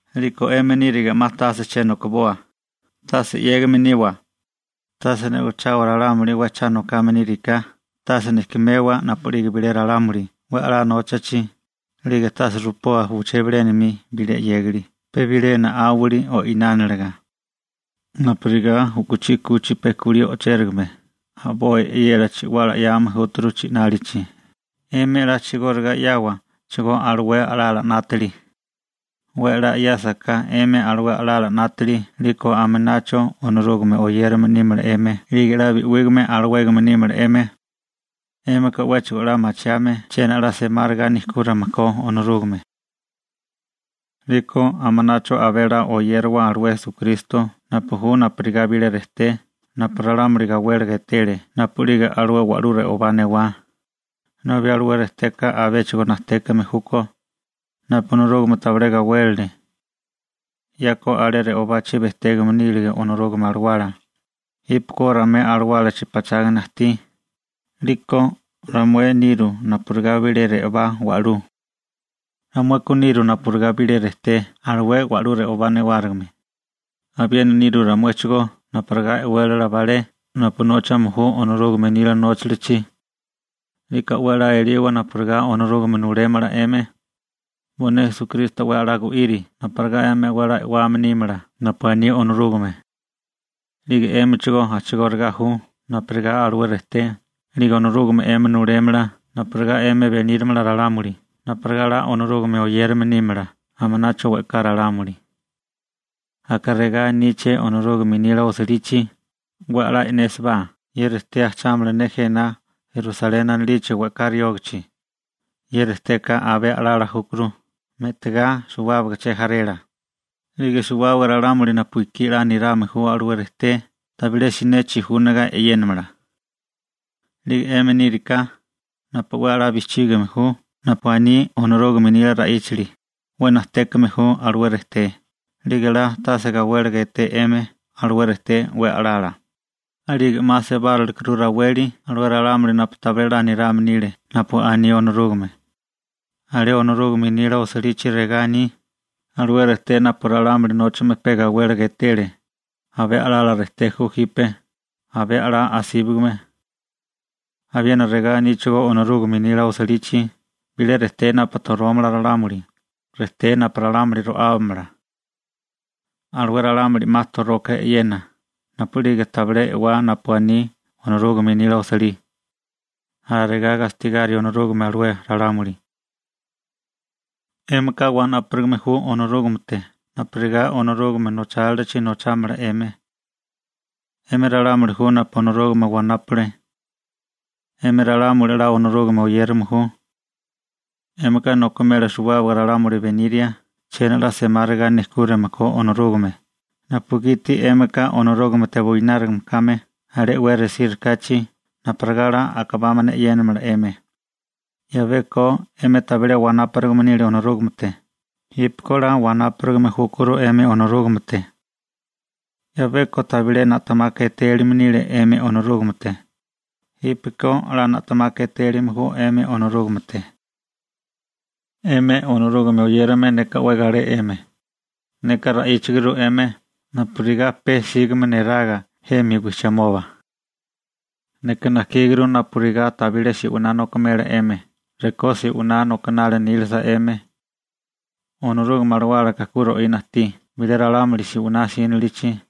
'Liko 'emi níriga 'ma tase cha nokiboa, tase 'yégame niwa, tase ne'ochawa ralámuli 'we cha nokame níriká, tase nejkemewa napu'lige bilé ralámuli 'we 'la nóchachi, 'lige tase rupoa uché bilénami bilé 'yégali pe bilé na'áwali o'inániliga. Napurigá u'kuchí 'kuchi pe kulí o'chérigame a'boi e'yela chi'wala 'yáame júturu chi'nálichi, 'emi a'chigóriga 'yáawachigó alué a'lala 'nátili. 'We 'la 'yáasaká 'emi alué a'lala 'nátili 'liko aminacho Onorúgame oyérame nímala 'emi 'lige 'la bi'wígame alawégame nímala 'emi. 'Émika 'wéchigo 'la machiame chiena 'la semáriga nejkúrime ko Onorúgame. 'Liko aminacho abé a'lá oyériwa alué Esukristo napu ju napurigá bilé rejté napu ralámuli gawéliga etele napu'lige alué wa'lú re'obá newá, nobi alué rejteka abéchigo najtékame júkó, napu Onorúgame tabilé gawélele. 'Yako alé re'obachi bejtégame nile Onorúgame Alawala. Jípeko ramué alawálachi pachágana ajtí, 'liko ramué niru napurigá bilé re'obá wa'lú. Ramueka niru napurigá bilé rejté alué wa'lú re'obá newárigime. Abiena nirú ramuéchigó napurigá e'wélala balé napu nóchame ju Onorúgame nila nóchalichi. 'Liko 'we 'la eliwa napurigá Onorúgame nulémala 'emi. Bo'né Esukristo 'we 'la gu'iri napurigá 'emi 'la e'wame nímala napu aní Onorúgame. 'Lige 'émichigó a'chigóriga ju napurigá alué rejté, 'lige Onorúgame 'emi nulémala napurigá 'emi benírimala ralámuli napurigá 'la Onorúgame oyérame nímala aminacho we'ká ralámuli. Aka regá aníché Onorúgame nila osilichi: 'We 'la e'nésibá, ye rejté ajchámala ne jena Sioni anilichi we'ká riógichi, ye rejteka abé a'lala júkuru me'tigá suwábaga che jarela, 'lige suwábaga ralámuli napu ekí 'la nirame ju alué rejté, tabilé siné chijúniga e'yénamala. 'Lige 'emi níriká napu 'we 'la bijchígame ju napu aní Onorúgame nila ra'íchali, 'we najtékame ju alué rejté, 'lige 'la tase gawéliga eté 'emi alué rejté 'we a'lala. 'Lige 'ma sebárilekuru raweli alué ralámuli napu tabilé 'la nirame nile napu aní Onorúgame. Alé Onorúgame nila osilichi regá aní: Alué rejté napu ralámuli nóchame pe gawéliga etele, abé a'lala rejté ju jipe, abé a'lá asíbagame. Abiena regá aníchigó Onorúgame nila osilichi: Bilé rejté napu torómala ralámuli, rejté napu ralámuli ro'ábamala. Alué ralámuli 'ma toroka e'yena napu'lige tabilé e'wá napu aní Onorúgame nila osilí. Alarigá gastigari Onorúgame alué ralámuli. 'Émika wanáparigame ju Onorúgamete napurigá Onorúgame nochálilachi nochámala 'emi. 'Emi ralámuli ju napu Onorúgame wanápale. 'Emi ralámuli 'la Onorúgame oyérame ju. 'Émika nokimela suwábaga ralámuli beniria chiena 'la semáriga nejkúrame ko Onorúgame, napugiti 'émika Onorúgamete buinárigame kame alé 'we resírikáchi napurigá 'la a'kabámana e'yénamala 'emi. 'Yabeko 'emi tabilé wanáparigame nile Onorúgamete. Jípeko 'la wanáparigame júkuru 'emi Onorúgamete. 'Yabeko tabilé na'temaka etélime nile 'emi Onorúgamete, jípeko 'la na'temaka etélime ju 'emi Onorúgamete. 'Emi Onorúgame oyérame, neka 'we galé 'emi, neka ra'íchaguru 'emi napurigá pe sígame neraga jemi wijchimoba. Neka najkíguru napurigá tabilé se'winá nokimela 'emi rekó se'winá nokinali nílisa 'emi. Onorúgame Alawálaka ku ro'ina ajtí bilé ralámuli se'winá 'sínilichi.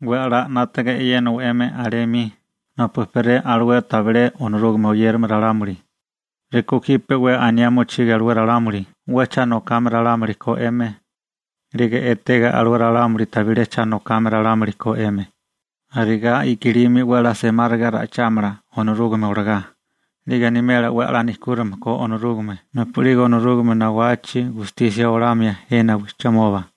'We a'lá 'nátaga e'yénawa 'emi alé 'mi napu ejperé alué tabilé Onorúgame oyérame ralámuli. Rekó jipe 'we aniá mochige alué ralámuli 'we cha nokame ralámuli ko 'emi, 'lige etega alué ralámuli tabilé cha nokame ralámuli ko 'emi, arigá i'kilimi 'we a'lá semáriga ra'ichámala Onorúgame olagá, 'lige animela 'we 'la nejkúrime ko Onorúgame napu'lige Onorúgame nawachi gustisia olamia jena wijchimoba.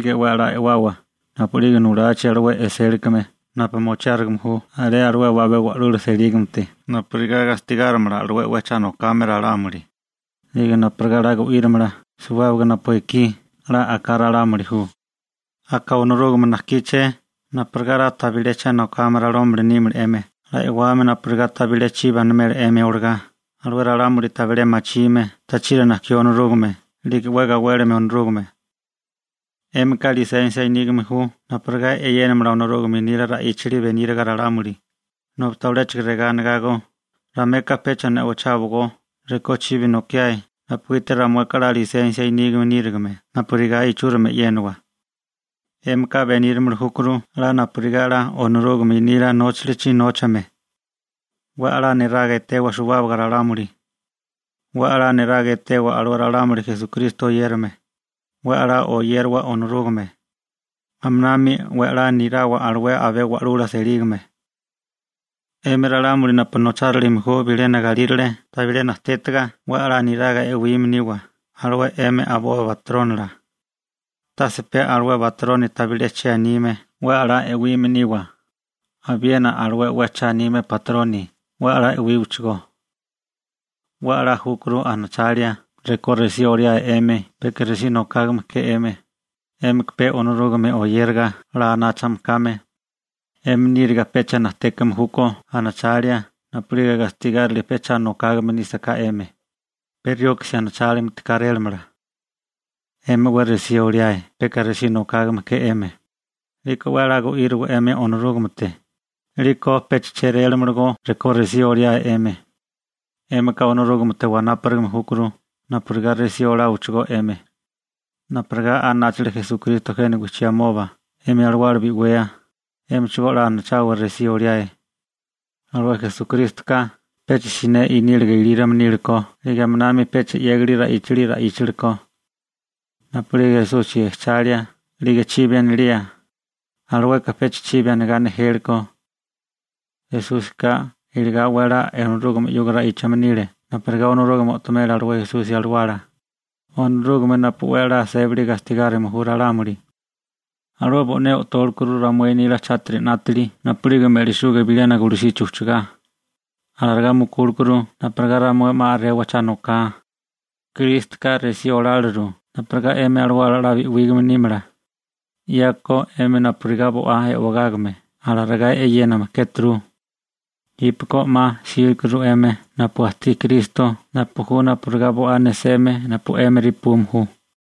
'Lige 'we 'la e'wawa napu'lige nulachi alué e'sélikame napu mochiárigime ju alué abé wa'lula selígamete, napurigá gastigárimala alué 'we cha nokame ralámuli, 'lige napurigá 'la gu'írimala suwábaga napu ekí 'la a'ká ralámuli ju. Aka Onorúgame najkíché napurigá 'la tabilé cha nokame ralámuli nímala 'emi 'la e'wame napurigá tabilé chibi animela 'emi olagá alué ralámuli tabilé machime tachiri najkió Onorúgame 'lige 'we gawélime Onorúgame. 'Émika lisensia nígame ju napurigá e'yénamala Onorúgame nila ra'íchali beníriga ralámuli, nobi tabiléchigo regá anigágó: «Ramueka pecha ne'ocháwagó rekó chibi nokiáe napugiti ramueka 'la lisensia nígame nírigime napurigá ichúrimi e'yéniwa.» 'Émika benírimili júkuru 'la napurigá 'la Onorúgame nila nóchalichi nóchame. 'We a'lá niraga etewa suwábaga ralámuli. 'We a'lá niraga etewa alué ralámuli Esukristo oyérame. 'We 'la oyériwa Onorúgame. Aminami 'we 'la nirawa alué abé wa'lula selígame. 'Emi ralámuli napu nochárilime ju bilena galírale tabilé najtétiga 'we 'la niraga e'wime niwa alué 'emi a'boi batrónila. Tase pe alué batroni tabilé che anime 'we a'lá e'wime niwa, abiena alué 'we cha anime batroni 'we a'lá e'wíwachigó. 'We a'lá júkuru anachalia rekó resí oliáe 'emi peka resí nokágame ke 'emi, 'émika pe Onorúgame oyériga 'la anáchame kame. 'Emi níriga pecha najtékame júkó anachalia napu'lige gastigárilia pe cha nokágame nísaká 'emi, pe rioksi anachálinti kárélamala. 'Emi 'we resí oliáe peka resí nokágame ke 'emi, 'liko 'we 'la gu'íriwa 'emi Onorúgamete, 'liko pecha chérélamalagó rekó resí oliae 'emi. 'Émika Onorúgamete wanápurigame júkuru napurigá resí oláwachigó 'emi. Napurigá anáchale Esukristo jena wijchimoba 'emi alawala bi'wea, 'émichigó 'la anachawa resí oliae. Alué Esukrístoka pecha siné iníliga ilírome níleko 'lige aminami pecha 'yégali ra'íchali ra'íchalekó. Napu'lige Esusi jechalia 'lige chibi anilía, alueka pecha chibi anigá nejélekó. Esúsika iligá 'we 'la Onorúgame 'yuga ra'íchame nile napurigá Onorúgame o'tomela alué Esusi alawala, Onorúgame napu 'we 'la sébali gastigárime ju ralámuli. Alué bo'né o'tólekuru ramué nila chátiri 'nátili napu'lige me'lisuga bilena gulusichi ujchagá, alarigá mukúlekuru napurigá ramué 'ma a'rewa cha noká. Krístoka resí oláliru napurigá 'emi alawala 'la bi'wígame nímala. 'Yako 'emi napurigá bo'á e'wegágame alarigá e'yéname kéturu. Jípeko 'ma jsílikuru 'emi napu ajtí Kristo napu ju napurigá bo'á neseme napu 'émi repume ju.